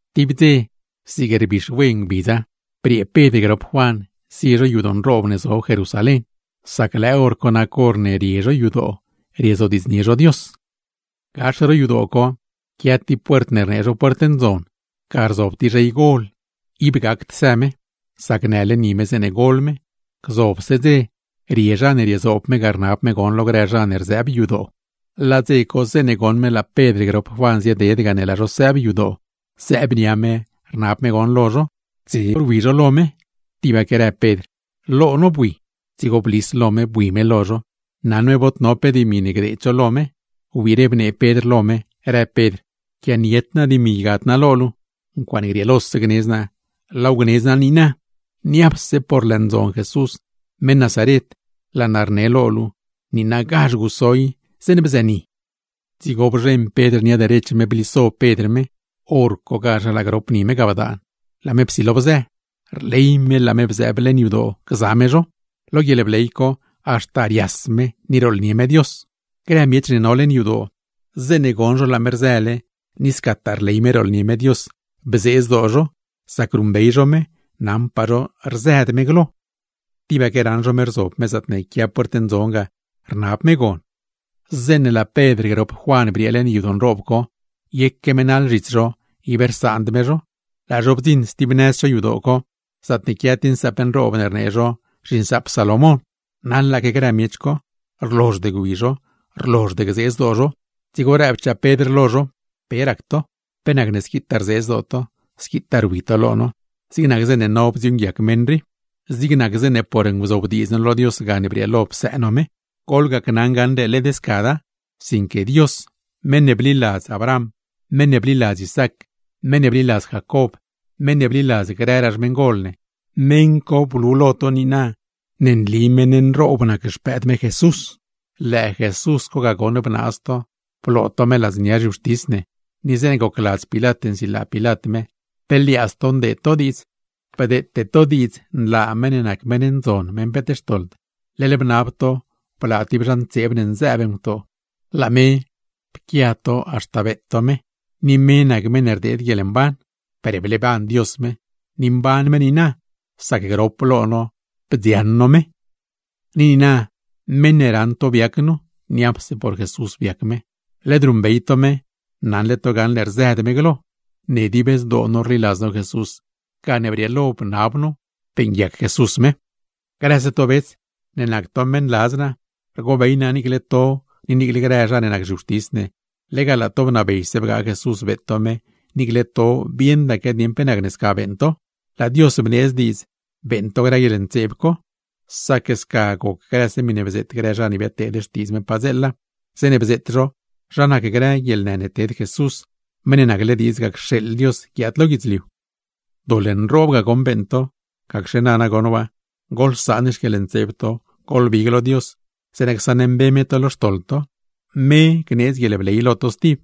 Tib dze zig rbixwe ngbidza, briee Pedr grop Juan zie zho yadoo nroob ne zob Jerusalén, sac lëë hor co nac horne rie zho yadoo riezodiidznie zho Dios. Gax ro yadoo co quia tib puert rnee zho Puert Ndzon, ga rzob tib zhey gol ib gacd së, sac nële ni me zeeṉe gol me. Gzobse dze, rie zha ne riezoob me ga rnab me gon lo grë zha ne rzëëb yadoo. Laa dze co, zeeṉe goṉ me laa Pedr grop Juan zieded ga ne laa zho sëëb yadoo, zëëb nia me rnab me gon lo zho. Dze rwi zho lo me, tibaque rëb Pedr: ―Lo no bui. Dzigo blis lo me bui me lo zho, naṉ me bod no pe dimi ne gdeed zho lo me. Wbiire bnee Pedr lo me, rëb Pedr: ―Quianied naa dimi ygad naa lo luu. Ncuaaṉe grieelose gnedz naa, laaw gnedz naa niina, ¡niapse por Jesús (meṉ Nazaret), laa naa rnab lo luu, niinagazh guso i zeeṉ bzëni! Dzigo bzheṉ Pedr nia derech me bliso Pedr me, hor cogazh laa grop ni me ga bdaan, laa me psilo bzë. Rley me laa me bzëëb leṉ yadoo gza me zho, lo guieḻbley co haxta rias me, ni rooḻnie me Dios. Grë miech ne no leṉ yadoo, zeeṉe goṉ zho laa me rzële, ni scataa rley me rooḻnie me Dios, bzee zdoo zho; sac ruṉbey zho me, naṉpaa zho rzëd me glo, tibaque raṉ zho me rzob me zaatne quia Puert Ndzon ga rnab me gon. Zeeṉe laa Pedr grop Juan briee leṉ yadoo nroob co, yeque me naḻ zhits zho ib rsaand me zho, laa zho bdziṉ stib nëz cho yadoo co zaatne quia tib nsaap nroob ne rnee zho zhiNsaap Salomón. Naḻaque grë miech co, rlozhd gwi zho, rlozhd gzee zdoo zho. Dzigo rëbchaa Pedr lo zho: ―¿Pe rac to? ¿Pe nacne squitaa rzee zdoo to, squitaa rwi to lo no, zig nac zeeṉe no bdziuuṉguiac meṉ rii, zig nac zeeṉe por nguzobdiidz no lo Dios gane brieelo psëë no me? Goḻgacnaṉ gaṉle led scada; sinque Dios meṉ ne bliladz Abraham, meṉ ne bliladz Isaac, meṉ ne bliladz Jacob, meṉ ne bliladz grëraa xmeṉgol ne, meṉ co blu lo to niina ne nli meṉ nroob nac Xpëëd me Jesús. Lëë Jesús co ga goṉ bnaaz to, bloo to me ladznia zhiwxtis ne, ni zeeṉe gocladz Pilat nsilaa Pilat me, pe liaadz to ndeed to diidz. Bdeete to diidz nlaa meṉ ne nac meṉ ndzon, meṉ ne peet xtoḻd; leḻ bnab to blaa tib zha ntseeb ne nzëëb ngutoo. Laa me, pquia to haxta beet to me, ni me nac meṉ ne rdeed guieḻmban. Per bleeban Dios me, ni mban me niina; sac grop lo no bdzioṉ no me. ’Ni niina meṉ ne raṉ to biac nu, niapse por Jesús biac me; led ruṉbeyle to me naṉle to gaṉle rzëd me glo. Ne dib zdoo no rliladz no Jesús, gane brieelo bnab no beeṉguiac Jesús me. ’Grëse to bets, ne nac to meṉladz naa, rgobey naa niicle to ni niiclegaa grë zha ne nac zhiwxtis ne, lega laa to bnabeyse bgaa Jesús beet to me, niicle to bieṉdaque dieṉ pe nacne sca beeṉ to. Laa Dios bneedz diidz beeṉ to grë guieḻntseeb co, sac sca goc grëse miṉe bzeet grë zha ne biadteed xtiidz Dios padzeela, zeeṉe bzeet zho zha nac grë guieḻnë ne ted Jesús, Meṉ ne nacle diidz cxeeḻ Dios guiaad lo guidzliu. ’Doḻ nroob ga goṉ beeṉ to, gacxe nana goṉ waa goḻsaan xquieḻntseeb to, goḻbig lo Dios; zeeṉa csaṉmbe me to lo xtoḻ to. Me gneedz guieḻbley lo to stib,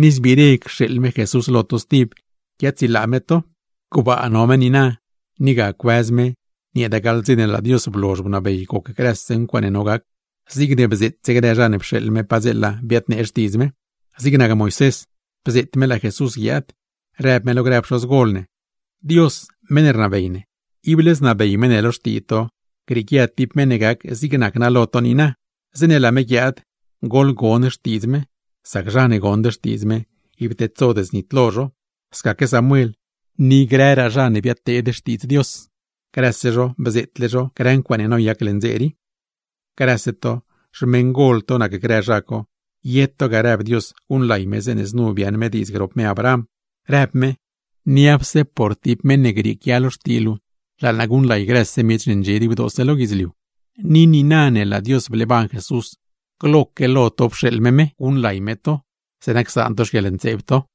ni zbiire cxeeḻ me Jesús lo to stib, guiaadsilaa me to. Gbaa no me niina, ni ga cuëz me nieeda gaḻ dze ne laa Dios blozh bnabey goc grëse ncuaaṉe none gac, zigne bzeetse grë zha ne pxeeḻ me padzeela, biadteed xtiidz me. Zig nac Moisés bzeet me laa Jesús guiaad, rëb me lo grë pxoz gol ne: “Dios meṉ ne rnabey ne, ible znabey me ne lo xtii to grieequia tib meṉ ne gac zig nac naa lo to niina. Zeeṉe laa me guiaad, goḻgon xtiidz me; sac zha ne gond xtiidz me, ib tedsod znitlo zho.” Scaque Samuel, ni grëraa zha ne biadteed xtiidz me, grëse zho bzeetle zho grë ncuaaṉe noyac leṉ dze rii. ’Grëse to, xmeṉgol to nac grë zha co, ye to ga rëb Dios guṉlay me zeeṉe znu biaaṉ me diidz grop me Abraham, rëb me: “Niapse por tib meṉ ne grieequia lo xtii luu, laa naa guṉlay grëse miech ne ndxie gdibdoose lo guidzliu.” Ni niina ne laa Dios bleeban Jesús, gloque lo to pxeeḻ me me, guṉlay me to, zeeṉa csaan to xquieḻntseeb to.